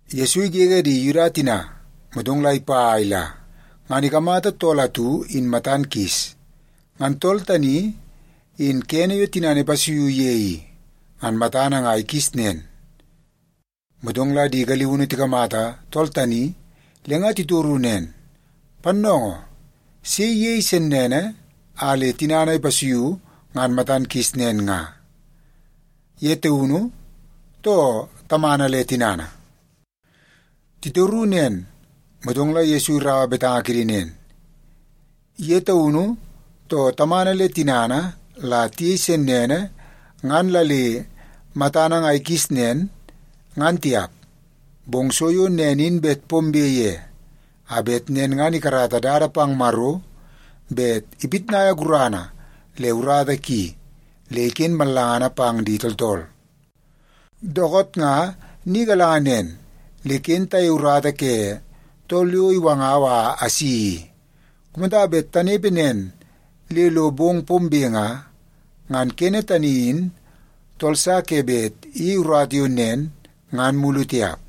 Yesu igege di Yuda tina, motong la ipa a ila, ngan ikamata tool atu in matan kis. Ngan tool tani in kene yo tinana ipasuiu ye i, ngan matana nga ikis nen. Motong la di galiunu tikamata tool tani le nga titoru nen, “Pannoongoo, sei iyei sennene a le tinana ipasuiu ngan matan kis nen nga, ye taunu, too tamana le tinana?” Titoru nen, motong la Yesu iraua betanga kidi nen, “Ye taunu, too tamana le tinana la tiyei sennene ngan la le matana nga ikis nen, ngan tiap. Bong so yo nen in bet pombe ye, a bet nen ngan ikarata dada pang Maro bet ipitnai gurana le urata ki le iken mallangana pang di tooltool. Dookoot nga ni galanga nen, le ken tayei urata ke tool yo iwangau a asi i. Kumata bet tanepe nen le lo bong pombe nga, ngan kene tani in tool sa ke bet iyei urata yo nen ngan mulu tiap.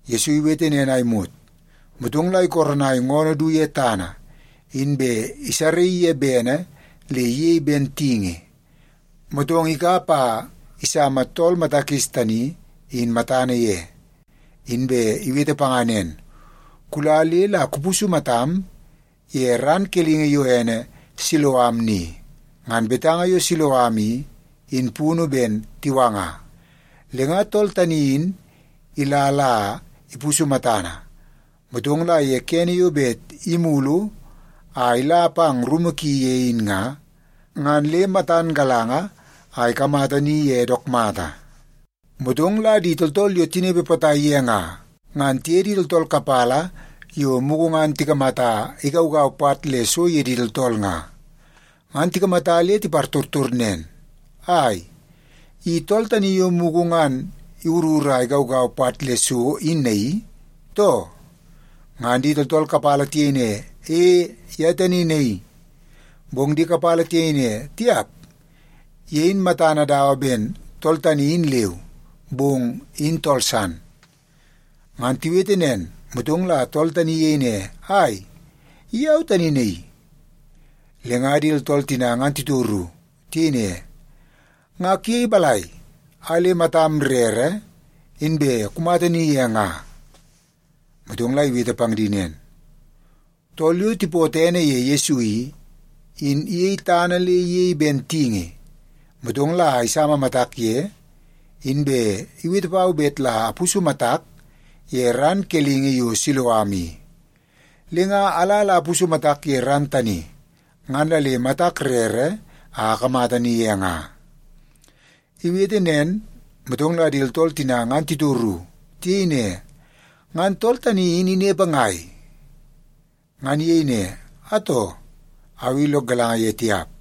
Yesu iwete nen a imot, motong la ikoronai ngoonoo du ye tana, inbe isaraii ye bene le iyei ben tingi, motong ikap a isama tool mata kis tani, in matana ye. Inbe iwete panga nen, “Kula le la kupusu matam ye ran kelingi yo ene Siloam ni.” (Ngan betanga yo Siloam i, in punu ben Tiwanga). Le nga tool tani in ila la ipusu matana, motong la ye kene yo bet imulu a ila pang rumu ki ye in nga, ngan le matan galanga a ikamata ni ye dook mata. Motong la di tooltool yo tinepe potai ye nga, ngan tiye di tooltool kapala yo mugu ngan tikamata igaugau pat le so ye di tooltool nga, ngan tikamata le tipartortor nen, “Ai, i tool tani yo mugu ngan iwurur a igaugau pat le so in naii, too?” Ngan di tooltool kapala tiyei ne, “E, ye tani naii.” Bong di kapala tiyei ne, “Tiap, ye in matana dawa ben tool tani in leu, bong in tool san.” Ngan tiwete nen, motong la tool tani iyei ne, “Ai, i au tani naii.” Le nga di tooltool tina ngan titoru. Tiyei ne, “Nga kuyei balai a le matam rere, inbe kumata ni ye nga?” Motong la iwete pang di nen, “Tool yo tipootoo ene ye Yesu i, in iyei tana le iyei ben tingi, motong la isama matak ye, inbe iwete pau bet la apusu matak ye ran kelingi yo Siloam i. Le nga ala la apusu matak ye ran tani, ngan la le matak rere a akamata ni ye nga.” Iwete nen, motong la di tooltool tina ngan titoru. Tiyei ne, “Ngan tool tani in inepe ngai?” Ngan iyei ne, “Atoo, au i lok galanga ye tiap.”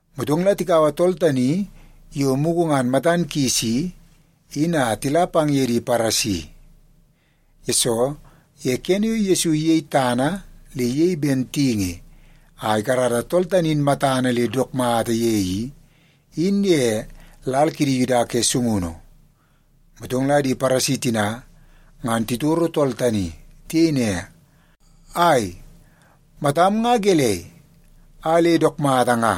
Motong la tikaua tool tani yo mugu ngan matan kis i, in a tila pang ye di Paresi. Yesoo, ye kene yo Yesu iyei tana le ben tingi a ikarata tool tani in matana le dook mata ye i, in ye lal kidi Yuda ke sungunu. Motong la di Paresi tina ngan titoro tool tani. Tiyei ne, “Ai, matam nga gelei a le dook mata nga?”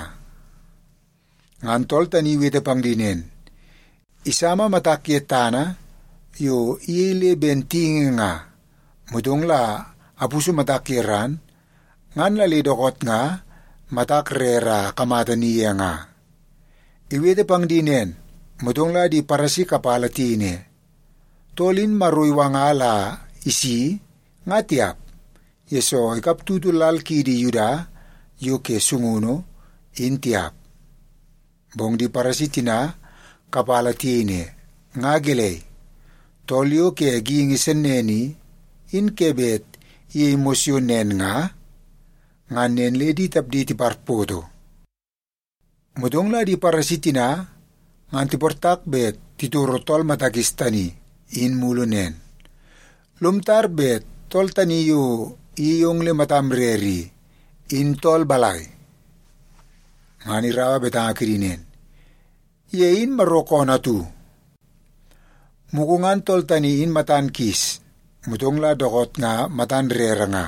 Ngan tool tani in iwete pang di nen, “Isama matak ye tana yo iyei le ben tingi nga, motong la apusu matak ye ran, ngan la le dookoot nga matak rere a akamata ni ye nga.” Iwete pang di nen, motong la di Paresi kapala tiyei ne, “Tool in Maro iwanga la isi, nga tiap, yesoo ikap tutu lal kiidi Yuda yo ke sungunu, in tiap.” Bong di Paresi tina kapala tiyei ne, “Nga gelei, tool yo ke geingi sennene i, in ke bet iyei mos yo nen nga?” Ngan nen le di tapdi tiparpoto. Motong la di Paresi tina ngan tiportak bet titoro tool mata kis tani, in mulu nen, “Lom tar bet tool tani yo iyei ong le matam rere i, in tool balai?” Ngan iraua betanga kidi nen, “Ye in Maro koonoo atu.” Mugu ngan tool tani in matan kis, motong la dookoot nga matan rere nga,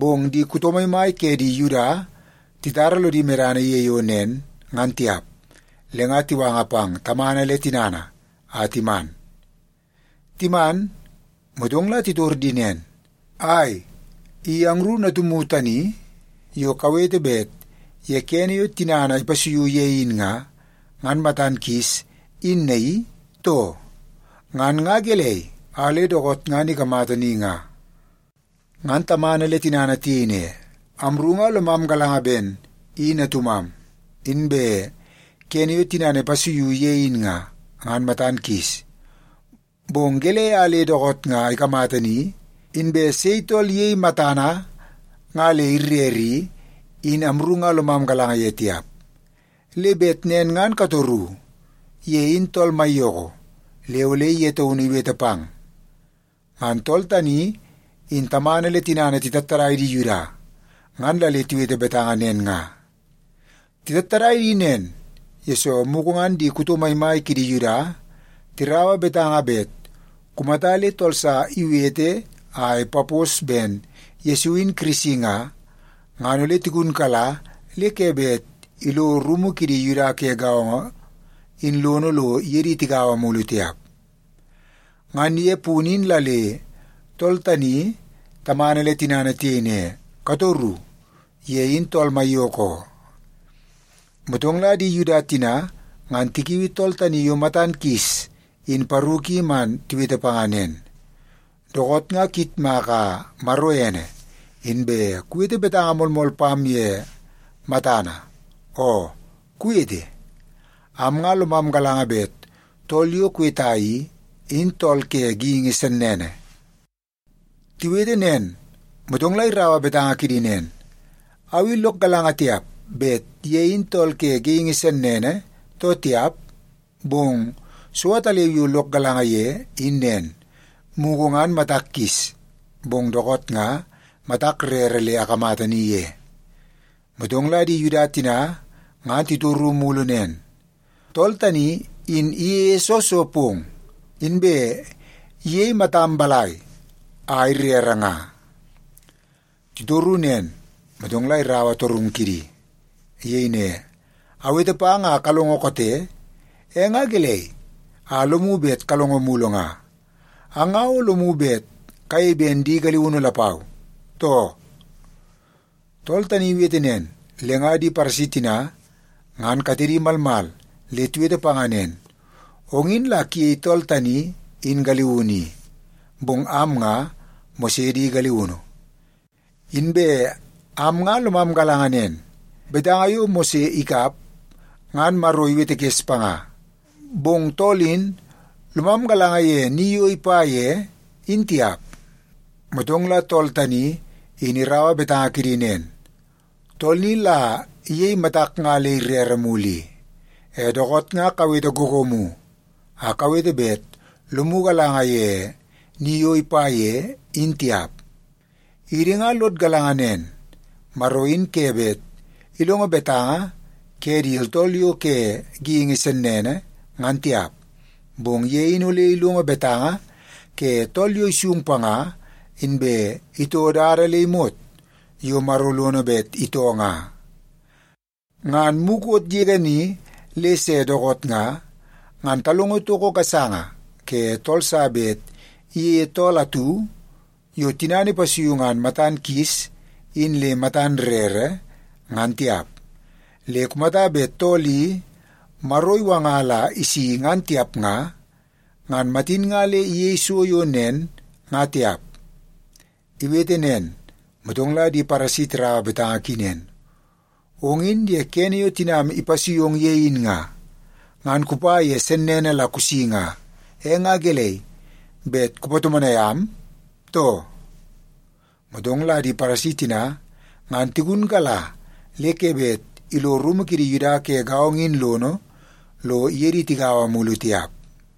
bong di kuto maimai ke di Yuda titara lodi medana ye yo nen, ngan tiap. Le nga tiwanga pang tamana le tinana a timan. Timan, motong la titor di nen, “Ai, i angru natumu tani yo kawete bet ye kene yo tinana ipasuiu ye in nga, ngan matan kis, in naii, too? Ngan nga gelei a le dookoot ngan ikamata ni nga?” Ngan tamana le tinana tiyei ne, “Amru nga lomam galanga ben i natumam, inbe kene yo tinana ipasuiu ye in nga, ngan matan kis. Bong gelei a le dookoot nga ikamata ni, inbe sei tool iyei matana nga le irere i, in amru nga lomam galanga ye tiap. Le bet nen ngan katoru. Ye in tool maiyoko, le ole ye taunu iwete pang.” Ngan tool tani in tamana le tinana titattadai di Yuda, ngan la le tiwete betanga nen nga. Titattadai di nen, yesoo mugu ngan di kuto maimai ke di Yuda tiraua betanga bet kumata le tool sa iwete a ipapos ben Yesu in Kirisi nga, ngan ole tigunkala le ke bet ilo rumu kidi Yuda ke gaongo in lono lo iye di tigaua mulu tiap. Ngan ye punu in la le tool tani tamana le tinana tiyei ne, “Katoru. Ye in tool maiyoko oo.” Motong la di Yuda tina ngan tikiui tool tani yo matan kis in paru ki man tiwete panga nen, “Dookoot nga kuyitmaka Maro ene, inbe kuwete betanga moolmool pam ye matana. Oo kuwete, am nga lomam galanga bet tool yo kuweta i, in tool ke geingi sennene.” Tiwete nen, motong la iraua betanga kidi nen, “Au i lok galanga tiap bet ye in tool ke geingi sennene, too tiap. Bong so ataleu yo lok galanga ye, in nen, mugu ngan matak kis, bong dookoot nga matak rere le akamata ni ye.” Motong la di Yuda tina ngan titoru mulu nen, “Tool tani in iyeie soo so pong? Inbe iyei matam balai a irere nga?” Titoru nen, motong la iraua torungu kidi. Iyei ne, “Awete pang a kalongo koote. E nga gelei a lomu bet kalongo mulu nga? Ang nga o lomu bet kayei ben di galiunu lapau, too?” Tool tani in iwete nen, le nga di Paresi tina ngan katedi malmal le tiwete panga nen, “Ong in la kuyei tool tani in galiunu i. Bong am nga Mose di galiunu. Inbe am nga lomam galanga nen, betanga yo Mose ikap, ngan Maro iwetekes panga. Bong tool in, lomam galanga ye ni yo ipa ye, in tiap.” Motong la tool tani in iraua betanga kidi nen, “Tool ni la iyei matak nga le irere mulu i. E, dookoot nga kawete googoomu a kawete bet lomu galanga ye ni yo ipa ye, in tiap. Idi nga lod galanga nen, Maro in ke bet ilongo betanga ke di tooltool yo ke geingi sennene, ngan tiap. Bong ye in ole ilongo betanga ke tool yo isung panga, inbe itoo dada le imot yo Maro lono bet itoo nga. Ngan mukot yege ni le se dookoot nga, ngan talongo toko gasanga ke tool sa bet iyeie tool atu yo tinana ipasuiu ngan matan kis in le matan rere, ngan tiap. Le kumata bet tool i Maro iwanga la isi ngan tiap nga, ngan matin nga le iyei so yo nen, nga tiap.” Iwete nen, motong la di Paresi tiraua betanga ki nen, “Ong in ye kene yo tinam ipasui ong ye in nga, ngan kupa ye sennene la kusi nga. E nga gelei, bet kupatomonai am, too?” Motong la di Paresi tina ngan tigunkala le ke bet ilo rumu kidi Yuda ke gaongo in lono lo iye di tigaua mulu tiap.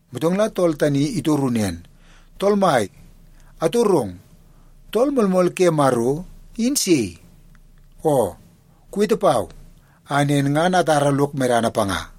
Motong la tool tani itoru nen, “Tool mai, atorong, Tool Moolmool ke Maro, in sei? Oo, kuweta pau a nen ngan atara lok medana panga.”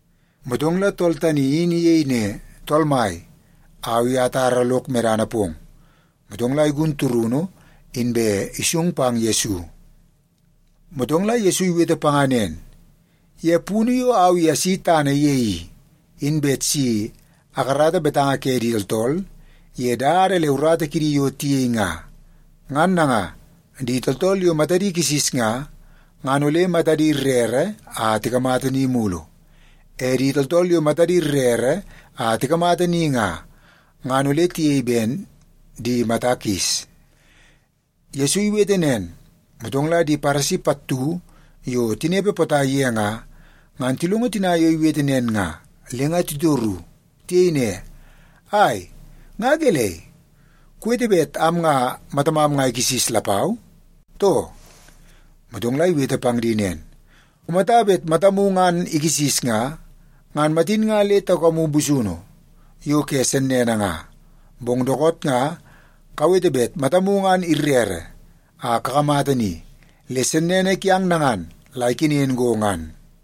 Motong la tool tani in iyei ne, “Tool Mai, au i atara lok medana pong.” Motong la igun turunu, inbe isung pang Yesu. Motong la Yesu iwete panga nen, “Ye punu yo au i asi tana ye i, in bet si akarata betanga ke di tooltool ye dada le urata kidi yo tiyei nga. Ngan nanga, di tooltool yo matadi kisis nga, ngan ole matadi rere a tikamata ni mulu. E di tooltool yo matadi rere a tikamata ni nga, ngan ole tiyei ben di mata kis.” Yesu iwete nen, motong la di Paresi pattu yo tinepe potai ye nga, ngan tilongo tina yo iwete nen nga, le nga titoru. Tiyei ne, “Ai, nga gelei? Kuwete bet am nga matamam nga ikisis lapau, too?” Motong la iwete pang di nen, “Kumata bet matamu ngan ikisis nga, ngan matin nga le taukamu busunu yo ke sennene nga. Bong dookoot nga kawete bet matamu ngan irere a kakamata ni, le sennene kiang nangan la ikenen go ngan.”